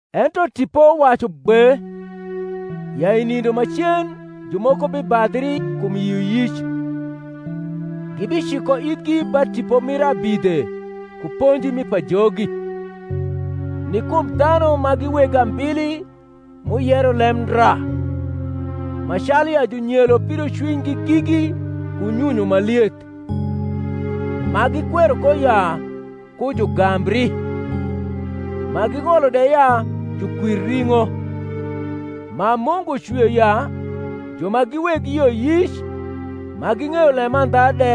Ento Tipo wacu gbe, ya i nindo macen jumoko bibadhri kum yioyic, gibiciko ithgi ba tipo mir abidhe ku ponji mi pajogi, ni kum dhanu ma gi weg ambili m’uyero lemndra, ma calu ya junyelo pidocwinygi gigi ku nyunyu ma lieth: ma gikwero ko ya ku jugambri, ma ging’olo de ya jukwir ring’o, ma Mungu cwio ya ju ma gi weg yioyic ma ging’eyo lemandha de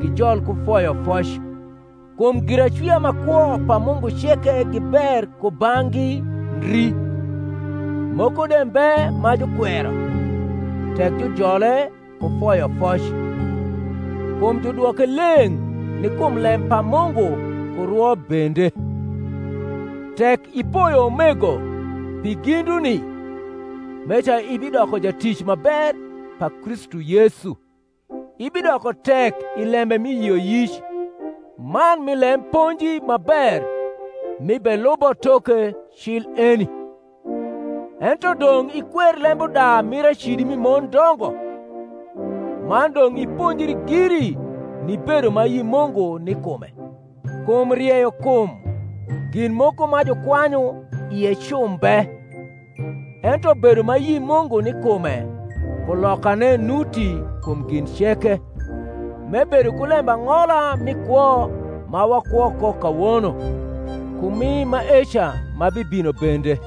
gijol ku foyofoc. Kum giracwia ma kwo pa Mungu ceke gi ber kubang’gi ndri, moko de mbe ma jukwero, tek jujole ku foyofoc: kum judwoke leng’ ni kum lem pa Mungu ku rwo bende. Tek ipoyo umego pi ginduni, meca ibidoko jatic ma ber pa Kristu Yesu, ibidoko tek i lembe mi yioyic, man mi lem ponji ma ber m’ibelubo toke cil eni: ento dong’ ikwer lembuda mir acidi mi mondongo. Man dong’ iponjri giri ni bedo ma ayi Mungu ni kume: kum rieyokum gin moko ma jukwanyu ie cu mbe; ento bedo ma ayi Mungu ni kume kulokane nuti kum gin ceke, m’ebedo ku lembang’ola mi kwo ma wakwo ko kawono, ku mi maeca ma bibino bende.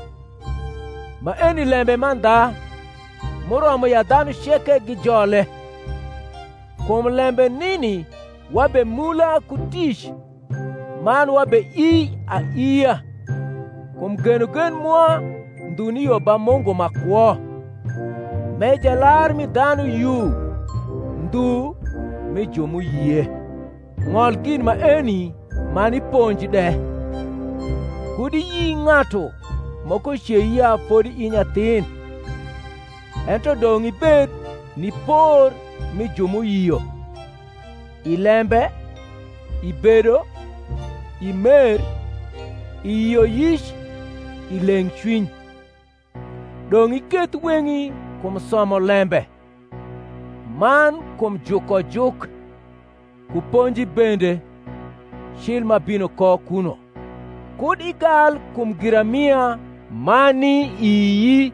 Maeni lembe mandha, m’uromo ya dhanu ceke gijole. Kum lembe nini wabemula ku tic man wabeii aiia, kum genogen mwa ndhu ni yo ba Mungu ma kwo, m’e Jalar mi dhanu yu, ndhu mi ju m’uyie. Ng’ol gin maeni man iponj de. Kud iyi ng’atu moko cei ya fodi i nyathin; ento dong’ ibed ni por mi ju m’uyio, i lembe, i bedo, i mer, i yioyic, i leng’cwiny. Dong’ iketh weng’i kum somo lembe, man kum jukojuk, ku ponji bende, cil m’abino ko kuno. Kud igal kum giramia ma ni ii,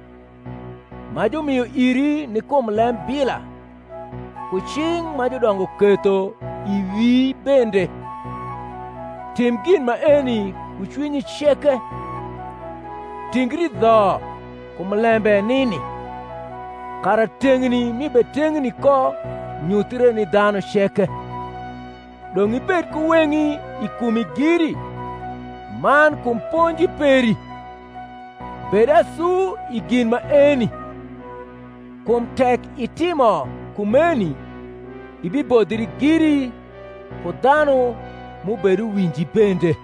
ma jumio iri ni kum lembila, ku cing’ ma judongo ketho i wii bende. Tim gin maeni ku cwinyi ceke; tingri dho kum lembe nini; kara teng’ni m’ibeteng’ni ko nyuthre ni dhanu ceke. Dong’ ibed ku weng’i i kumi giri, man kum ponji peri. Bed asu i gin maeni; kum tek itimo kumeni ibibodhri giri ku dhanu m’ubeduwinji bende.